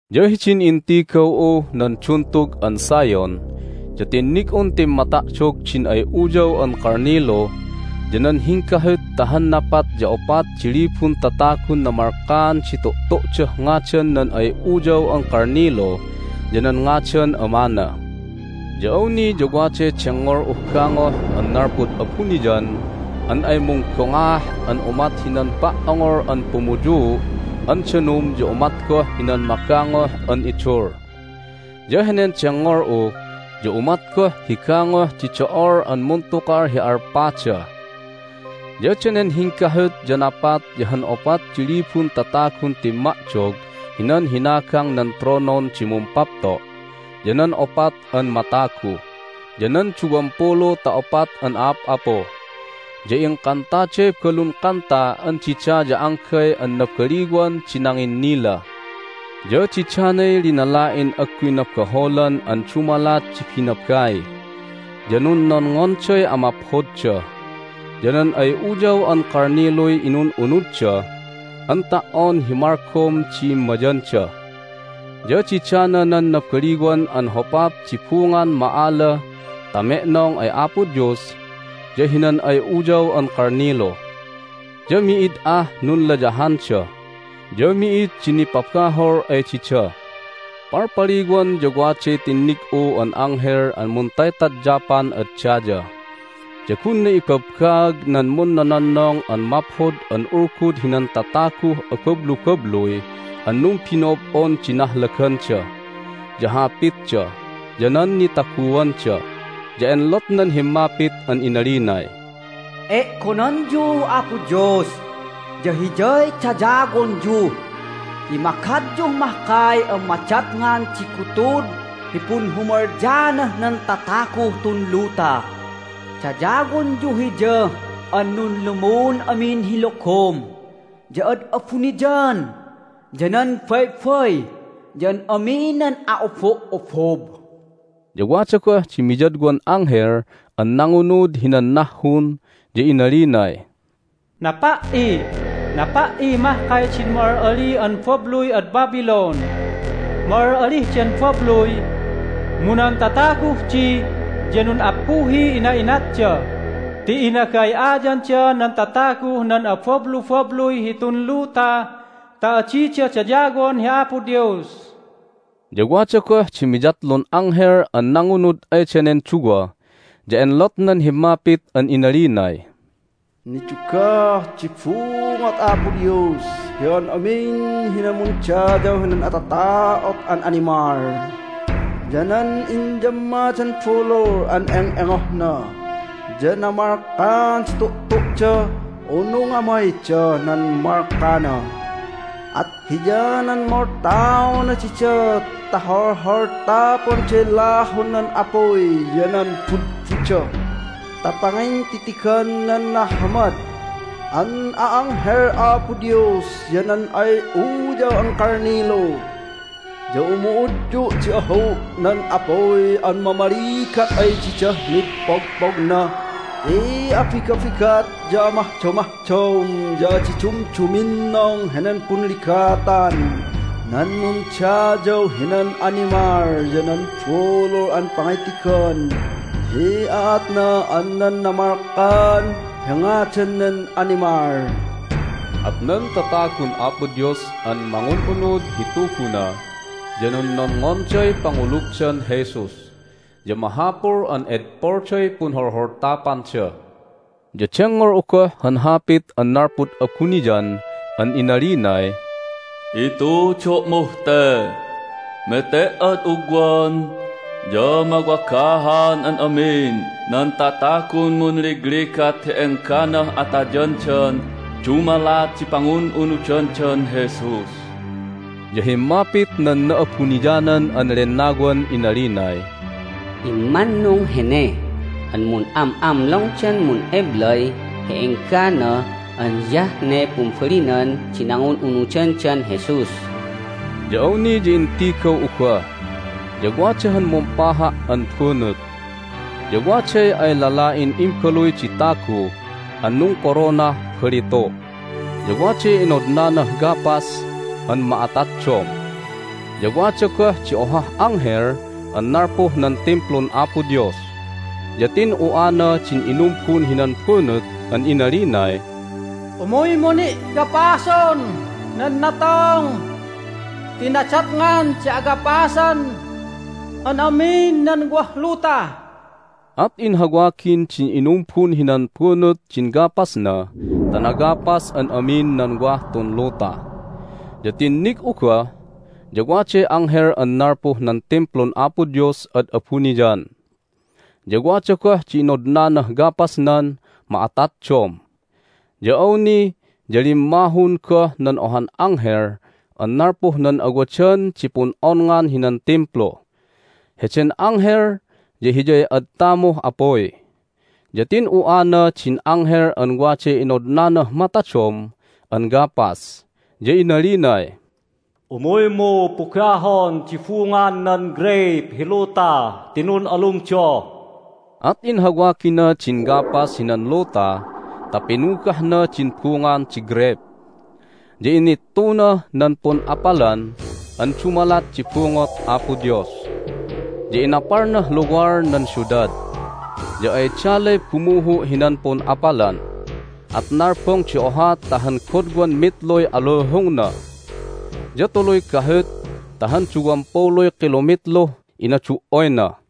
Ya hidin intigaw'uh nan Duntug an Zion ya tinnig'un timmata'dog din ay Uyaw an Kalnilu ya nan hinggahut ta han napat ya opat di libun tatagun namalkaan di tu'tu'dah ngadan nan ay Uyaw an Kalnilu ya nan ngadan Amana. Ya awni ya waday dengngol'uh gangoh an nalpud abuniyan an ay munggongaah an umat hinan pa"ongol an pumuyuu' an danum ya umat goh hinan magangoh an idul. Ya henen dengngol'u ya umat goh hi gangoh di do'ol an muntukal hi alpada. Ya danen hinggahut ya napat ya han opat di libun tatagun timma'dog hinan hinagang nan tronon di Mumpapto', ya nan opat an matagu, ya nan duwampulu ta opat an a'ap'apu. Ya ingkantaday balun kanta an dida ya anggay an nabaliwan di nanginnila. Ya didanay linala'in agguy nabaholan an dumalat di binabai, ya nunnonngonday amaphodda. Ya nan ay Uyaw an Kalniluy inun'unudda an ta"on hi malgom di immayanda. Ya didana nan nabaliwan an hopap di bungan ma'ala ta me'nong ay Apo Dios ya hinan ay Uyaw an Kalnilu. Ya mi'id ah nunlayahanda, ya mi'id di nipabahol ay dida. Palpaliwan ya waday tinnig'u an anghel an muntaytadyapan ad daya. Ya gunna ibabbaag nan munnononnong an Maphod an Ulgud hinan tataguh abablubabluy an numbino'ob'on di nahlaganda, ya hapitda, ya nan nitaguanda. Ya enlotnan himmapit an inalinay, "E'gonanyuh Apo Dios, ya Hiyay dayawonyu! Ti magadyuh mahkay an madatngan di gutud hi punhumalyaanah nan tataguh tun luta! Dayawonyu Hiya an nunlumun amin hi logom, ya ad abuniyan, ya nan baybay, ya an amin nan a'obo'obob!" Ya wada goh di miyadwan anghel an nangunud hinan nahhun, ya inalinay, "Napa"i! Napa"i mahkay din ma'al'ali an babluy ad Babylon! Ma'al'alih den babluy, mu nan tataguh di ya nun'appuhiy ina'inatda ti inagay'ayanda nan tataguh nan abablubabluy hitun luta ta adida dayawon hi Apo Dios!" Ya wada goh di miyatlun anghel an nangunud ay danen duwa, ya enlotnan himmapit an inalinay, "Nidugah di bungot Apo Dios hi an amin hinan mundayaw hinan atata'ot an animal, ya nan inyammadan bulul an eng'engohna, ya namalkaan di tu'tu'da unu ngamaydah nan malkana, at hiyanan moltaona dida ta holholtaponday lahun nan apuy ya nan budbuda ta pangintitigan nan nahamad an a'anghel Apo Dios ya nan ay Uyaw an Kalnilu. Ya umu'udyu' di ahu' nan apuy an mamaligat ay didah mid pogpogna ti abigabigat ya amahdomahdom ya adi dumduminnong henen punligatan nan nundayaw hinan animal ya nan bulul an pangitigan hi aatna an nan namalkaan hi ngadan nen animal." At nan tatagun Apo Dios an mangun'unud hi Tuguna ya nunnonngonday pangulugdan Jesus, ya mahapul an edpolday punholholtapanda. Ya dengngol'u goh han hapit an nalpud abuniyan an inalinay, "Itudo'muh te: Mete"ad ugwan ya mawagahan an amin nan tatagun munligligat hi engganah atayandan dumalat di pangun'unudandan Jesus!" Ya himmapit nan Na'abuniyanan an Lennawan inalinay, "Immannung hene an mun'am'amlongdan mun'eblay hi enggana an hiyah ne pumbalinan di nangun'unudandan Jesus." Ya awni ya intigaw'u goh, ya wada han mumpaha' an bunut, ya waday ay lala'in Imbaluy di Tagu an nungkoronah balitu', ya waday inodnanah gapas an ma'ataddom. Ya wada goh di ohah anghel an nalpuh nan Timplun Apo Dios, ya tin'u'ana din inumbun hinan bunut an inalinay, "Umuymu ni' gapason nan natong ti nadatngan di agapasan an amin nan wah luta!" At inhawagin din inumbun hinan bunut din gapasna ta nagapas an amin nan wah tun luta. Ya tinnig'u goh, ya waday anghel an nalpuh nan Timplun Apo Dios ad abuniyan, ya wada goh di inodnanah gapasnan ma'attaddom. Ya awni ya limmahun goh nan ohan anghel an nalpuh nan awadan di pun'onngan hinan Timplu. Heden anghel ya hiyay ad tamuh apuy. Ya tin'u'ana din anghel an waday inodnanah matadom an gapas, ya inalinay, "Umuymu pugahon di bungan nan greyp hi luta ti nun'alumda!" At inhawagina din gapas hinan luta ta pinugahna din bungan di greyp, ya inittunah nan pun'apalan an dumalat di bungot Apo Dios. Ya inapalnah luwal nan siudad, ya ay dalay bumuhu' hinan pun'apalan, at nalbong di oha ta han godwan mitluy aluhungna, ya tuluy gahut ta han duwampuluy kilomitluh inadu"oyna.